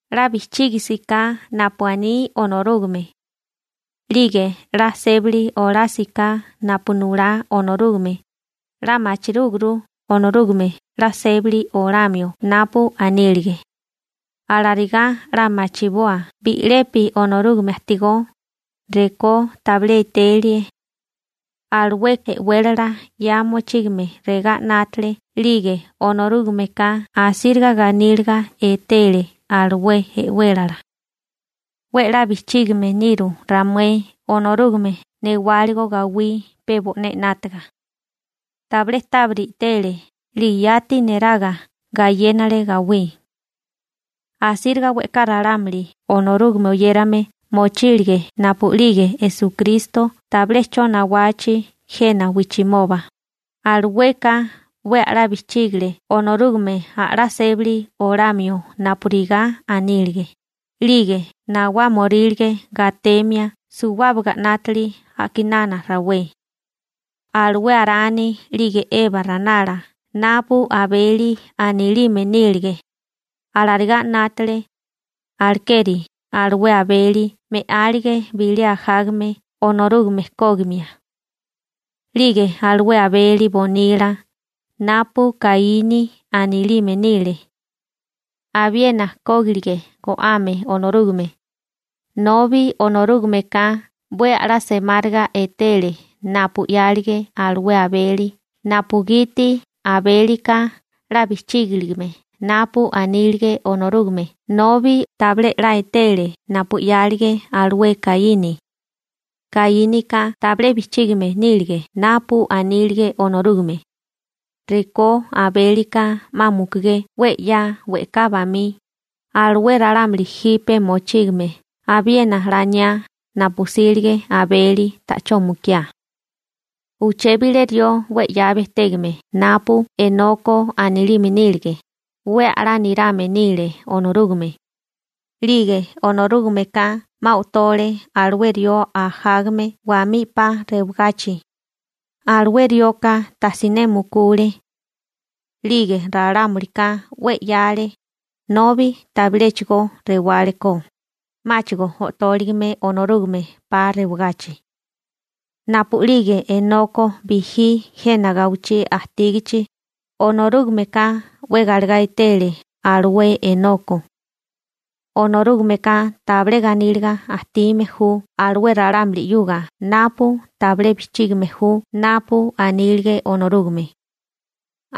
'La bijchígisiká napu aní Onorúgame, 'lige 'la sébali olásiká napu nulá Onorúgame, 'la machirúguru Onorúgame 'la sébali olamio napu anílige. Alarigá 'la machiboa bi'lepi Onorúgame ajtigó, rekó tabilé etelie. Alué e'wélala 'ya mochígame regá 'nátale 'lige Onorúgameka asíriga ganíliga etele alué e'wélala. 'We 'la bijchígime niru ramué Onorúgame newáligo gawí pe bo'né 'nátaga. Tabilé tábiri i'tele, 'lige yati neraga gayénale gawí. Asíriga we'ká ralámuli Onorúgame oyérame mochílige napu'lige Esukristo tabilé 'cho nawachi jena wijchimoba, alueka 'we a'lá bijchígale Onorúgame a'lá sébali olamio napurigá anílige, 'lige nawámiorílige gatemia suwábaga 'nátili a'kinana rawé. Alué Arani 'lige Eba ranala napu Abeli anilime nílige, alarigá 'nátale, alekeri alué Abeli me'álige bilé ajágame Onorúgame kógimia. 'Lige alué Abeli bonila napu Kaíni anilime nile, abiena kógilige go'ame Onorúgame. Nobi Onorúgameka 'we a'lá semáriga etele napu 'yálige alué Abeli napugiti Abélika 'la bijchígilime napu anílige Onorúgame nobi tabilé 'la etele napu 'yálige alué Kaíni. Kaínika tabilé bijchígime nílige napu anílige Onorúgame. Rekó Abélika 'ma mukugé 'we 'ya we'ká bamí, alué ralámuli jipe mochígame abiena laniá napu 'sílige Abeli ta'chó mukiá. Uché bilé rió 'we 'ya bejtégame napu Enoko anilime nílige, 'we a'lá nirame nile Onorúgame. 'Lige Onorúgameka 'ma o'tole alué rió ajágame wamí 'pa rewagachi, alué rioka tajsiné mukule. 'Lige ralámulika 'we 'yáale nobi tabiléchigo rewáleko, 'máchigo o'tóligime Onorúgame 'pa rewagachi. Napu'lige Enoko bijí jena gawichí ajtígachi, Onorúgameka 'we galegá etele alué Enoko. Onorúgameka tabilé ganíliga ajtime ju alué ralámuli 'yuga napu tabilé bijchígime ju napu anílige Onorúgame.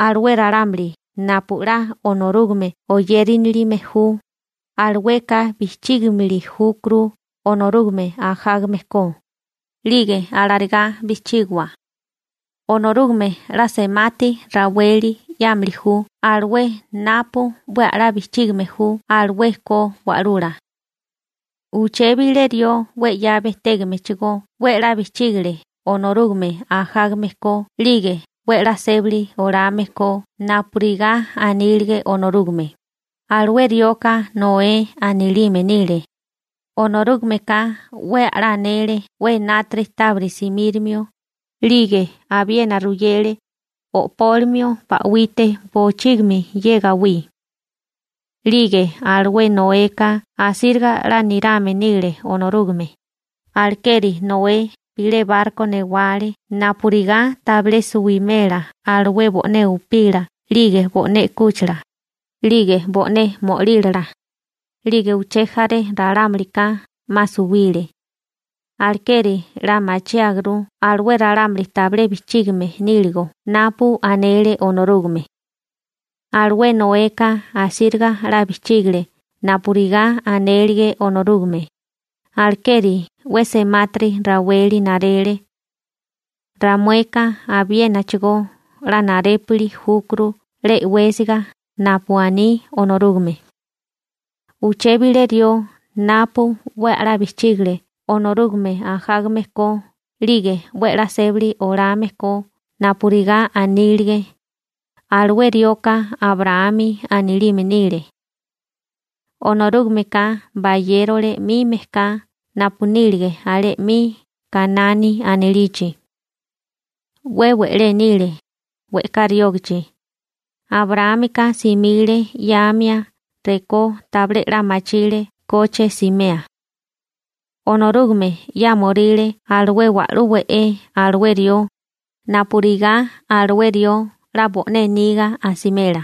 Alué ralámuli napu 'la Onorúgame oyérinilime ju, alueka bijchígimili júkuru Onorúgame ajágame ko, 'lige alarigá bijchígiwa, Onorúgame 'la semati raweli 'yámili ju alué napu 'we a'lá bijchígime ju alué ko wa'lula. Uché bilé rió 'we 'ya bejtégamechigó 'we 'la bijchígale Onorúgame ajágame ko 'lige 'we 'la sébali olame ko napurigá anílige Onorúgame, alué rioka Noé anilime nile. Onorúgameka 'we a'lá anele 'we enátiri tábiri simírimio, 'lige abiena ruyele o'pólimio ba'wite bochígimi ye gawí. 'Lige alué Noeka asíriga 'la nirame nile Onorúgame, alekeri Noé bilé barko newale napurigá tabilé suwimela alué bo'né upila 'lige bo'né u'kúchila, 'lige bo'né mo'lílala. 'Lige uché jaré ralámulika 'ma suwile. Alekeri 'la machiáguru alué ralámuli tabilé bijchígime níligo napu anele Onorúgame. Alué Noeka asíriga 'la bijchígale napurigá anélige Onorúgame, alekeri 'we semátiri raweli narele. Ramueka abiénachigó 'la narépili júkuru 'la e'wésiga napu aní Onorúgame. Uché bilé rió napu 'we a'lá bijchígale Onorúgame ajágame ko, 'lige 'we 'la sébali olame ko napurigá anílige, alué rioka Abraámi anilime nile. Onorúgameka bayérole 'mi mejká napu nílige alé 'mi Kanani anilichi. 'We we'lé nile, we'ká riógachi. Abraámika simile 'yáamia rekó tabilé 'la machime ke koche simea. Onorúgame 'yámoríle alué wa'lú we'é alué rió, napurigá alué rió 'la bo'né niga asimela.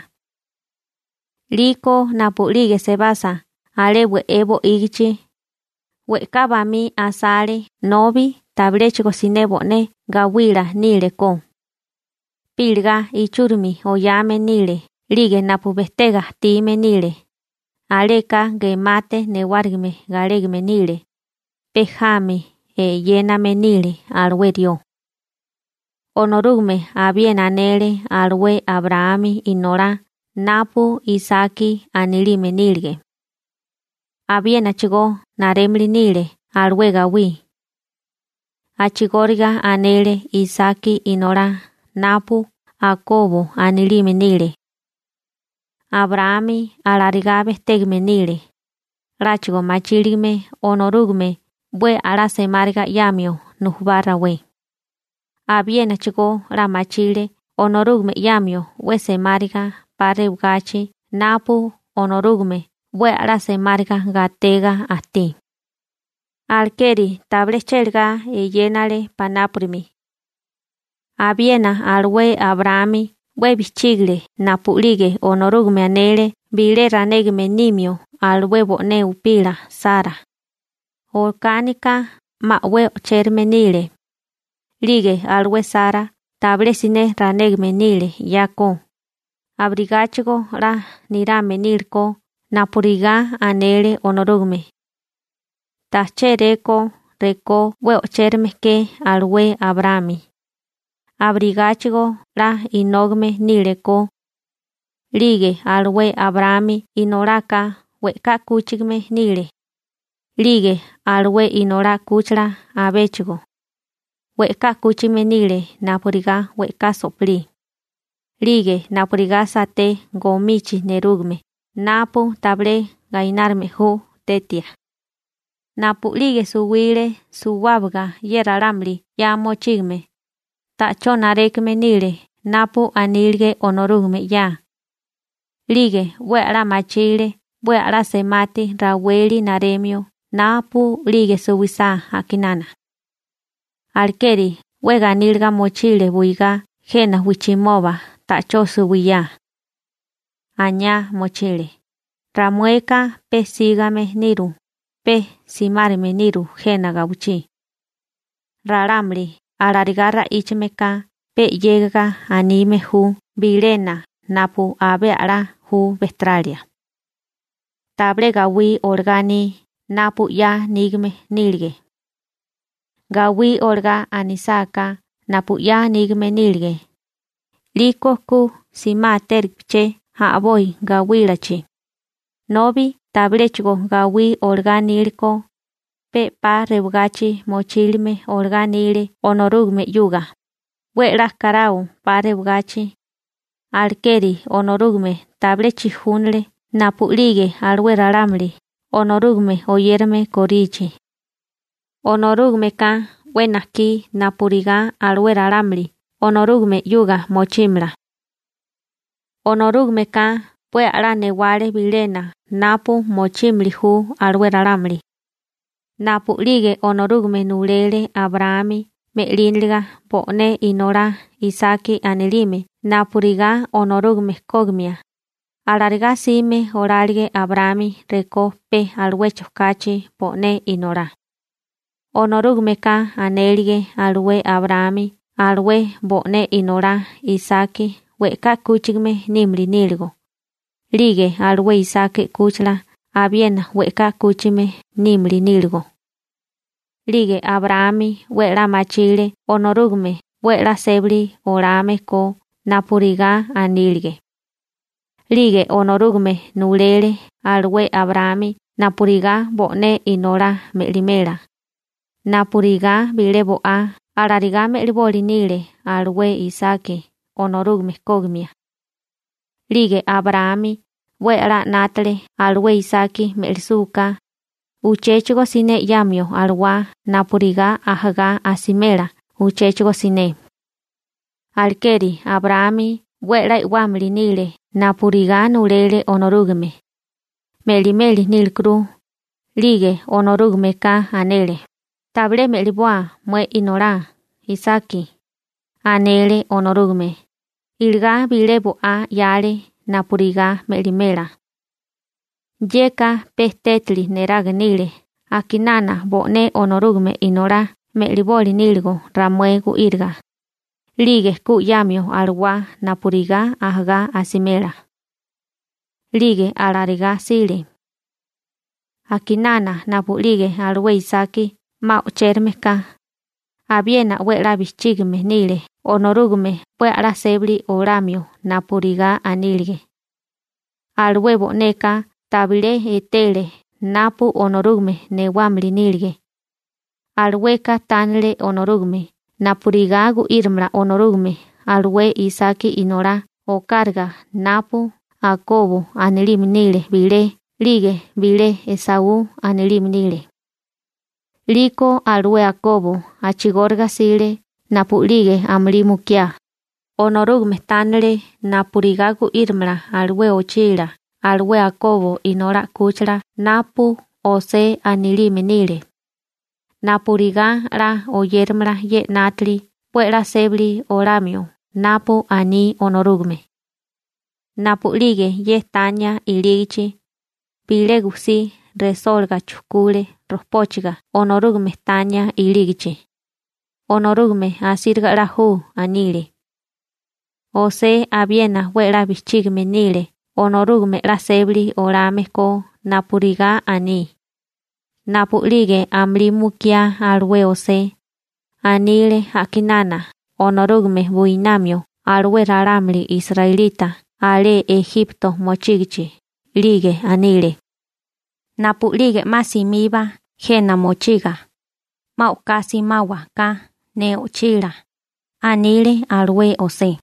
'Liko napu'lige sebasa alé we'é bo'ígichi, we'ká bamí asale nobi tabiléchigo siné bo'né gawila nílekó. Pe iligá ichúrimi oyame nile 'lige napu bejtébaga ajtime nile, aleka gemate newárigime galégame nile, pe jami eyéname nile alué rió. Onorúgame abiena anele alué Abraámi inolá napu Isaki anilime nílige, abiénachigó narémili nile alué gawí. A'chigóriga anele Isaki inolá napu Akobo anilime nile. Abraámi alarigá bejtégame nile, 'láchigo machíligame Onorúgame 'we a'lá semáriga 'yamio nujubá rawé. Abiénachigó 'la machile Onorúgame 'yamio 'we semáriga 'pa rewagachi napu Onorúgame 'we a'lá semáriga gatega ajtí. Alekeri tabilé chélagá eyénale panápurimi. Abiena alué Abraámi 'we bijchígale napu'lige Onorúgame anele bilé ranégame nimio alué bo'né upila Sara. Okánika 'ma 'we o'chérame nile, 'lige alué Sara tabilé siné ranégame nile 'yako, abirigáchigo 'la nirame nílekó napurigá anele Onorúgame. Ta chéréko rekó 'we o'chérame ke alué Abraámi, abirigáchigo 'la inógame nílekó. 'Lige alué Abraámi inolaka we'ká 'kúchigame nile. 'Lige alué inolá 'kúchila abéchigo, we'ká 'kúchigame nile napurigá we'ká so'pilí, 'lige napurigá saté gomichi nerúgame, napu tabilé gainárime ju tetia. Napu'lige suwile suwábaga ye ralámuli 'ya mochígame, ta'chó narékame nile napu anílige Onorúgame 'ya. 'Lige 'we a'lá machile 'we a'lá semati raweli naremio napu'lige suwisá a'kinana. Alekeri 'we ganíliga mochile buigá jena wijchimoba ta'chó suwiyá. Aniá mochile: «Ramueka pe sígame niru, pe simárime niru jena gawichí.» Ralámuli alarigá ra'íchame ka pe 'yégiga anime ju bilena napu abé a'lá ju bejteralia. Tabilé gawí olagá aní napu 'ya nígame nílige. Gawí olagá anisáká napu 'ya nígame nílige, 'liko ku simátéligipaché a'boi gawílachi. Nobi tabiléchigo gawí olagá aníleko, pe 'pa rewagachi mochílime olagá anile Onorúgame 'yuga, 'we 'la karao 'pa rewagachi. Alekeri Onorúgame tabilé chijúnale napu'lige alué ralámuli Onorúgame oyérame korichi. Onorúgameka 'we najkí napurigá alué ralámuli Onorúgame 'yuga mochímala. Onorúgameka 'we a'lá newale bilena napu mochímili ju alué ralámuli. Napu'lige Onorúgame nulele Abraámi me'líniliga bo'né inolá Isaki anilime napurigá Onorúgame kógimia, alarigá 'sime olálige Abraámi rekó pe aluecho kachi bo'né inolá. Onorúgameka anélige alué Abraámi alué bo'né inolá Isaki we'ká 'kúchigame nímili níligo, 'lige alué Isaki 'kúchila abiena we'ká 'kúchigame nímili níligo. 'Lige Abraámi 'we 'la machile Onorúgame 'we 'la sébali olame ko napurigá anílige. 'Lige Onorúgame nulele alué Abraámi napurigá bo'né inolá me'limela, napurigá bilé bo'á alarigá me'liboli nile alué Isaki Onorúgame kógimia. 'Lige Abraámi 'we 'la 'nátale alué Isaki me'lisúká, uchéchigo siné 'yamio alawá napurigá ajagá asimela uchéchigo siné. Alekeri Abraámi 'we 'la e'wámili nile napurigá nulele Onorúgame, me'limeli nílekuru, 'lige Onorúgameka anele, «Tabilé me'liboa mué inolá Isaki», anele Onorúgame, iligá bilé bo'á 'yale napurigá me'limela. Yeka pe tétali neraga nile a'kinana bo'né Onorúgame Inolá me'liboli níligo ramué gu'íriga, 'lige ku 'yamio alawá napurigá ajagá asimela. 'Lige alarigá 'sile. A'kinana napu'lige alué Isaki 'ma o'chérame ka, abiena 'we 'la bijchígime nile Onorúgame 'we a'lá sébali olamio napurigá anílige. Alué bo'neka tabilé etele napu Onorúgame newámili nílige. Alueka tánale Onorúgame napurigá gu'írimala Onorúgame alué Isaki inolá okáraga napu Akobo anilime nile bilé 'lige bilé Esaú anilime nile. 'Liko alué Akobo a'chigóriga 'sile napu'lige amulí mukiá, Onorúgame tánale napurigá gu'írimala alué ochila alué Akobo inolá 'kúchila napu José anilime nile, napurigá 'la oyéramala ye 'nátili 'we 'la sébali olamio napu aní Onorúgame. Napu'lige ye tania ilígichi, bilé gujsí resólaga chujkule rojpóchiga Onorúgame tania ilígachi. «Onorúgame asíriga 'la ju», anile. José abiena 'we 'la bijchígame nile Onorúgame 'la sébali olame ko napurigá aní. Napu'lige amulí mukiá alué José, anile a'kinana Onorúgame buinamio alué ralámuli israelita alé Ejipto mochígichi, 'lige anile: «Napu'lige 'ma simiba jena mochiga, 'ma o'ká simáwaká ne o'chilá», anile alué José.»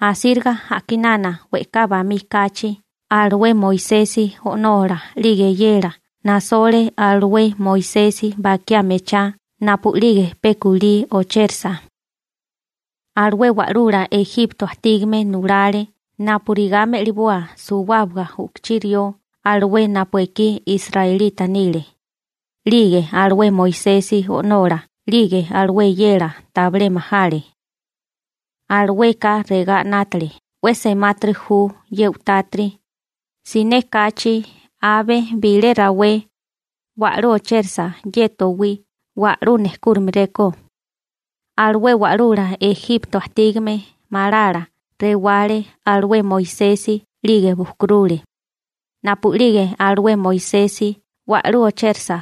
Asíriga a'kinana we'ká bamí kachi alué Moisesi o'nola 'lige eyela nasole alué Moisesi bakiá mechá napu'lige pe kulí ochérisa. Alué wa'lula Ejipto ajtígame nulale napurigá me'liboa suwábaga u'kuchí rió alué napu ekí israelita nile, 'lige alué Moisesi o'nola 'lige alué eyela tabilé majale. Alueka regá 'nátale: «'We semátiri ju ye u'tátiri, siné kachi abe bilé rawé wa'lú ochérisa ye towí wa'lú nejkúrimeréko.» Alué wa'lula Ejipto ajtígame malala rewale alué Moisesi 'lige bujkurule. Napu'lige alué Moisesi wa'lú ochérasa,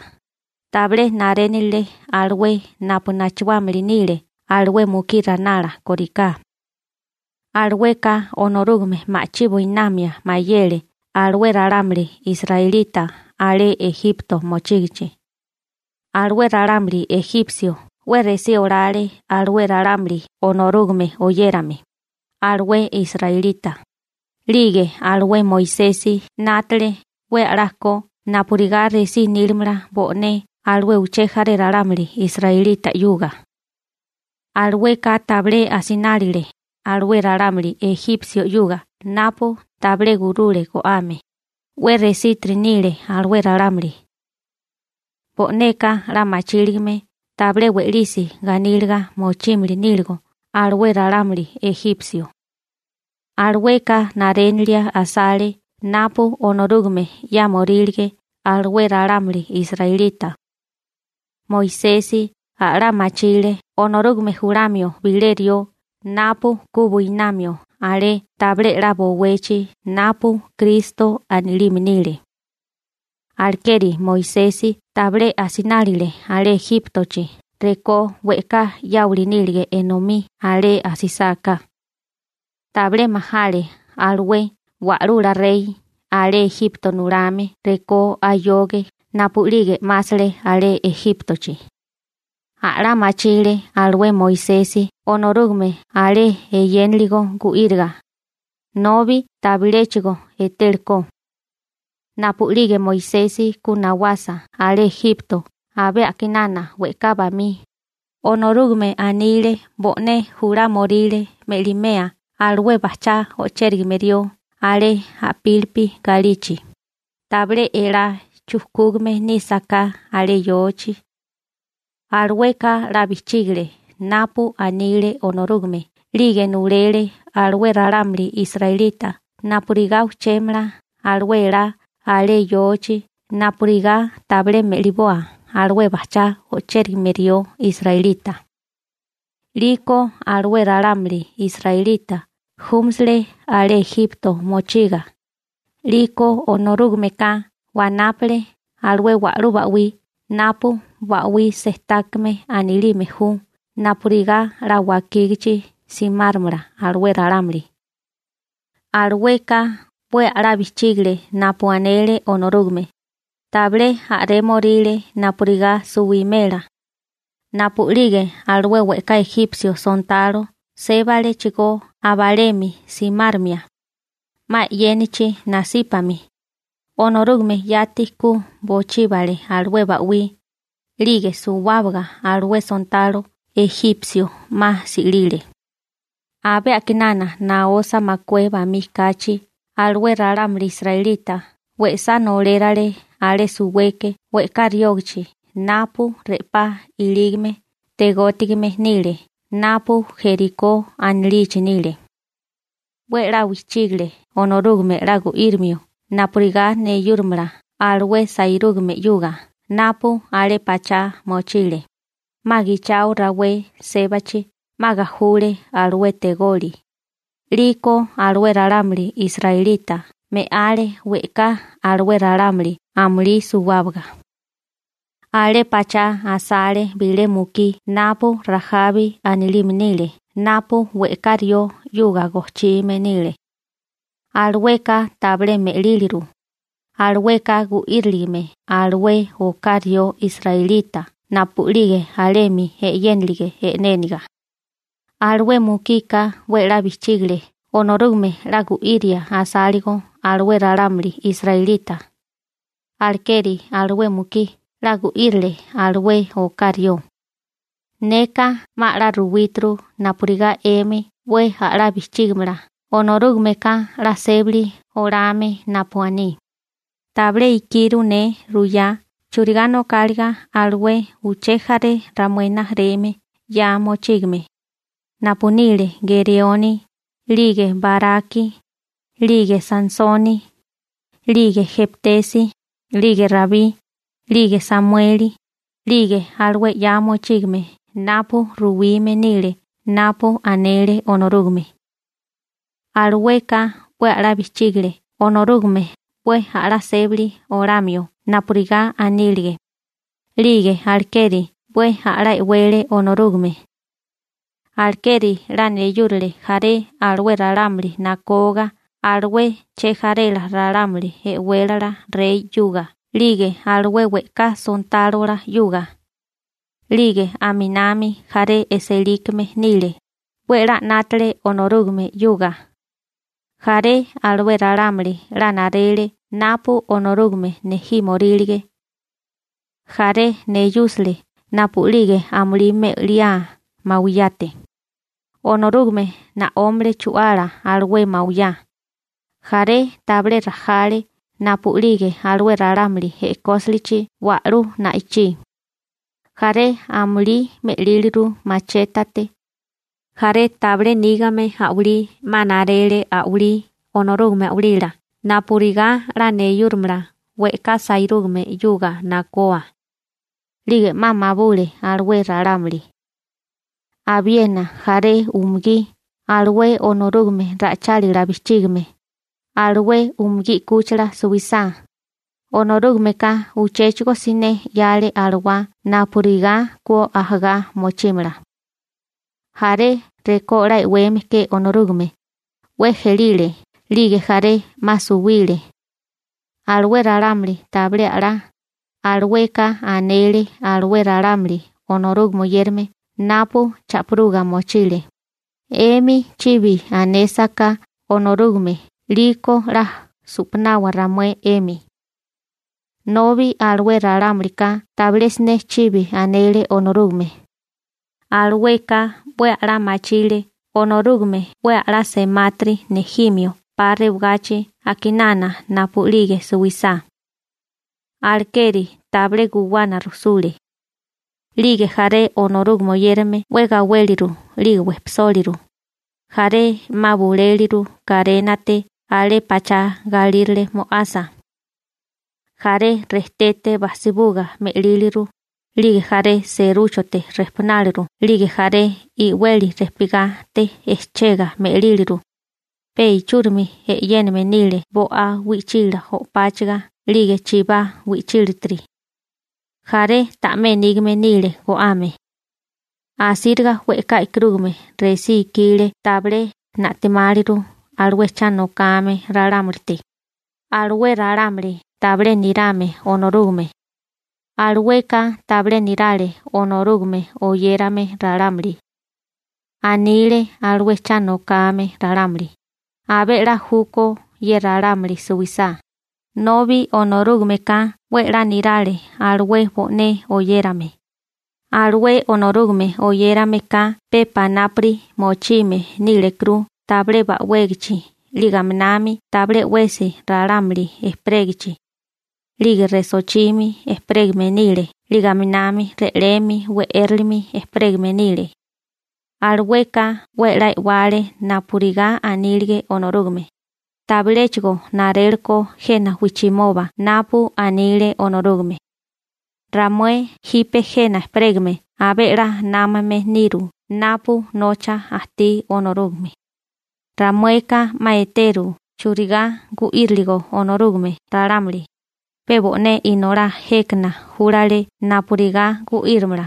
tabilé narénilile alué napu nachuámili nile alué mukí ranala kóriká. Alueka Onorúgame ma'chí buinamia mayele alué ralámuli israelita alé Ejipto mochígichi. Alué ralámuli ejipsio 'we resí olale alué ralámuli Onorúgame oyérame, alué israelita, 'lige alué Moisesi 'nátele 'we a'lá ko napurigá resí nílamala bo'né alué uché jaré ralámuli israelita 'yuga. Alueka tabilé asinálile alué ralámuli ejipsio 'yuga napu tabilé gurule go'ame, 'we resítiri nile alué ralámuli. Bo'neka 'la machíligame tabilé we'lisi ganíliga mochímili níligo alué ralámuli ejipsio. Alueka narénilia asale napu Onorúgame 'yámorílige alué ralámuli israelita. Moisesi a'lá machile Onorúgame julamio bilé rió napu ku buinamio alé tabilé 'la bowechi napu Kristo anilime nile. Alekeri Moisesi tabilé asinálile alé Ejíptochi rekó we'ká 'yáwili nílige enomí alé asisáká. Tabilé majale alué wa'lula rey alé Ejipto nulame rekó ayoge napu'lige 'másale alé Ejíptochi. A'lá machile alué Moisesi Onorúgame alé eyénaligo gu'íriga, nobi tabiléchigo etélekó. Napu'lige Moisesi ku nawasa alé Ejpipto abé a'kinana we'ká bamí, Onorúgame anile bo'né julámoríle me'limea alué bajchá ochérigame rió alé a'pílipi galichi, tabilé elá chujkúgame nísaká alé yochi. Alueka 'la bijchígale napu anile Onorúgame 'lige nulele alué ralámuli israelita napurigá ujchémala alué elá alé yochi napurigá tabilé me'liboa alué bajchá o'chérigame rió israelita. 'Liko alué ralámuli israelita júmasile alé Ejipto mochiga, 'liko Onorúgameka wanápale alué wa'lú ba'wí napu Ba'wí Sejtákame anilime ju napurigá 'la wakígachi simáromala alué ralámuli. Alueka 'we a'lá bijchígale napu anele Onorúgame, tabilé a'rémoríle napurigá suwimela. Napu'lige alué we'ká ejipsio sontalo sébalechigó abalemi simáromia, 'ma e'yénachi nasípami, Onorúgame yati ku bochíbale alué ba'wí, 'lige suwábaga alué sontalo ejipsio 'ma si'lile. Abé a'kinana naosa makué bamí kachi alué ralámuli israelita we'sá nolérale alé suweke we'ká riógichi napu re'pá ilígame tegótigame nile napu Jerikó anilichi nile. 'We 'la bijchígale Onorúgame 'la gu'írimio napurigá neyúrimala alué sairúgame 'yuga napu alé pachá mochile, 'ma gichao rawé sébachi 'ma gajule alué tegoli, 'liko alué ralámuli israelita me'ale we'ká alué ralámuli amulí suwábaga. Alé pachá asale bilé mukí napu Rajabi anilime nile napu we'ká rió 'yuga gojchime nile. Alueka tabilé me'líliru, alueka gu'íriligime alué oká rió israelita napu'lige alemi e'yénilige e'néniga. Alué mukika 'we 'la bijchígale Onorúgame 'la gu'iria asáligo alué ralámuli israelita, alekeri alué mukí 'la gu'írile alué oká rió. Neka 'ma 'la ruwíturu napurigá 'emi 'we a'lá bijchígimala Onorúgameka 'la sébali oláame napu aní. Tabilé ikiru ne ruyá churigá nokáliga alué uché jaré ramué rijimala 'ya mochígame, napu nile Gereoni, 'lige Baraki, 'lige Sansoni, 'lige Jeptesi, 'lige Rabí, 'lige Samueli, 'lige alué 'ya mochígame napu ruwime nile napu anele Onorúgame. Alueka 'we a'lá bijchígile Onorúgame 'we a'lá sébali olamio napurigá anílige, 'lige alekeri 'we a'lá e'wele Onorúgame. Alekeri 'la neyúrale jaré alué ralámuli nakoga alué chejarela ralámuli e'wélala rey 'yuga 'lige alué we'ká sontálola 'yuga. 'Lige aminami jaré e'sélikame nile, 'we 'la 'nátale Onorúgame 'yuga. Jaré alué ralámuli 'la narele napu Onorúgame nejímorílige. Jaré neyúsale napu'lige amulí me'liá mawiyate. Onorúgame na'ómale chu'ala alué mawiyá. Jaré tabilé rajale napu'lige alué ralámuli e'kósilichi wa'lú na'ichí. Jaré amulí me'líliru machétate. Jaré tabilé nígame a'walí 'ma narele a'walí Onorúgame a'walila napurigá 'la neyúromala we'ká sairúgame 'yuga nakoa, 'lige 'ma mabule alué ralámuli. Abiena jaré umugí alué Onorúgame ra'ichálila bijchígime, alué umugí 'kúchila suisá, Onorúgameka uchéchigo siné 'yale alawá napurigá ku ajagá mochímala. Jaré rekó 'la e'weme ke Onorúgame, 'we ejelile 'lige jaré 'ma suwile. Alué ralámuli tabilé a'lá, alueka anele alué ralámuli Onorúgame oyérame napu cha'piruga mochile: «'Emi chibi anésaká Onorúgame 'liko 'la su'panawa ramué 'emi.» Nobi alué ralámulika tabilé siné chibi anele Onorúgame. Alueka 'we a'lá machile Onorúgame 'we a'lá semátiri nejimio 'pa rewagachi a'kinana napu'lige suwisá. Alekeri tabilé guwana rujsule. 'Lige jaré Onorúgame oyérame 'we gawéliru 'lige wejpisóliru, jaré 'ma buléliru karénate alé pachá galírale mo'asa. Jaré rejtete bajsibuga me'líliru, 'lige jaré serúchote rejpunáleru 'lige jaré i'weli rejpigate ejchega me'líliru. Pe ichúrimi e'yéname nile bo'á wi'chila o'páchiga 'lige chibá wi'chílatiri. Jaré ta'mé nígame nile go'ame. Asíriga we'ká e'karúgame resí ikile tabilé na'timáliru alué cha nokame ralámulite. Alué ralámuli tabilé nirame Onorúgame, alueka tabilé nirale Onorúgame oyérame ralámuli. Anile alué cha nokame ralámuli: «Abé 'la júkó ye ralámuli suwisá», nobi Onorúgameka 'we 'la nirale alué bo'né oyérame. Alué Onorúgame oyérame ka pe panápuri mochime nílekuru tabilé ba'wégachi 'lige aminami tabilé 'wesi ralámuli ejperégichi. 'Lige resochimi ejperégame nile 'lige aminami re'lemi we'éralemi ejperégame nile. Alueka 'we 'la e'wale napurigá anílige Onorúgame, tabiléchigo naréleko jena wijchimoba napu anile Onorúgame. Ramué jipe jena ejperégame abé 'la námame niru napu nocha ajtí Onorúgame. Ramueka 'ma eteru churigá gu'íriligo Onorúgame ralámuli, pe bo'né Inolá jékana júlale napurigá gu'írimala.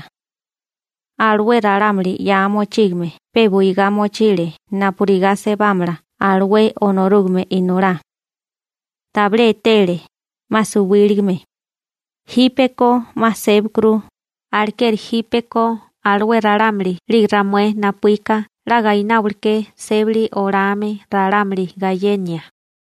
Alué ralámuli 'ya mochígame pe buigá mochile napurigá sebámala alué Onorúgame Inolá. Tabilé etele, 'ma suwíligame. Jípeko 'ma sébakuru, alekeri jípeko alué ralámuli 'lige ramué napuíka 'la gaináwaleké sébali olame ralámuli gayenia.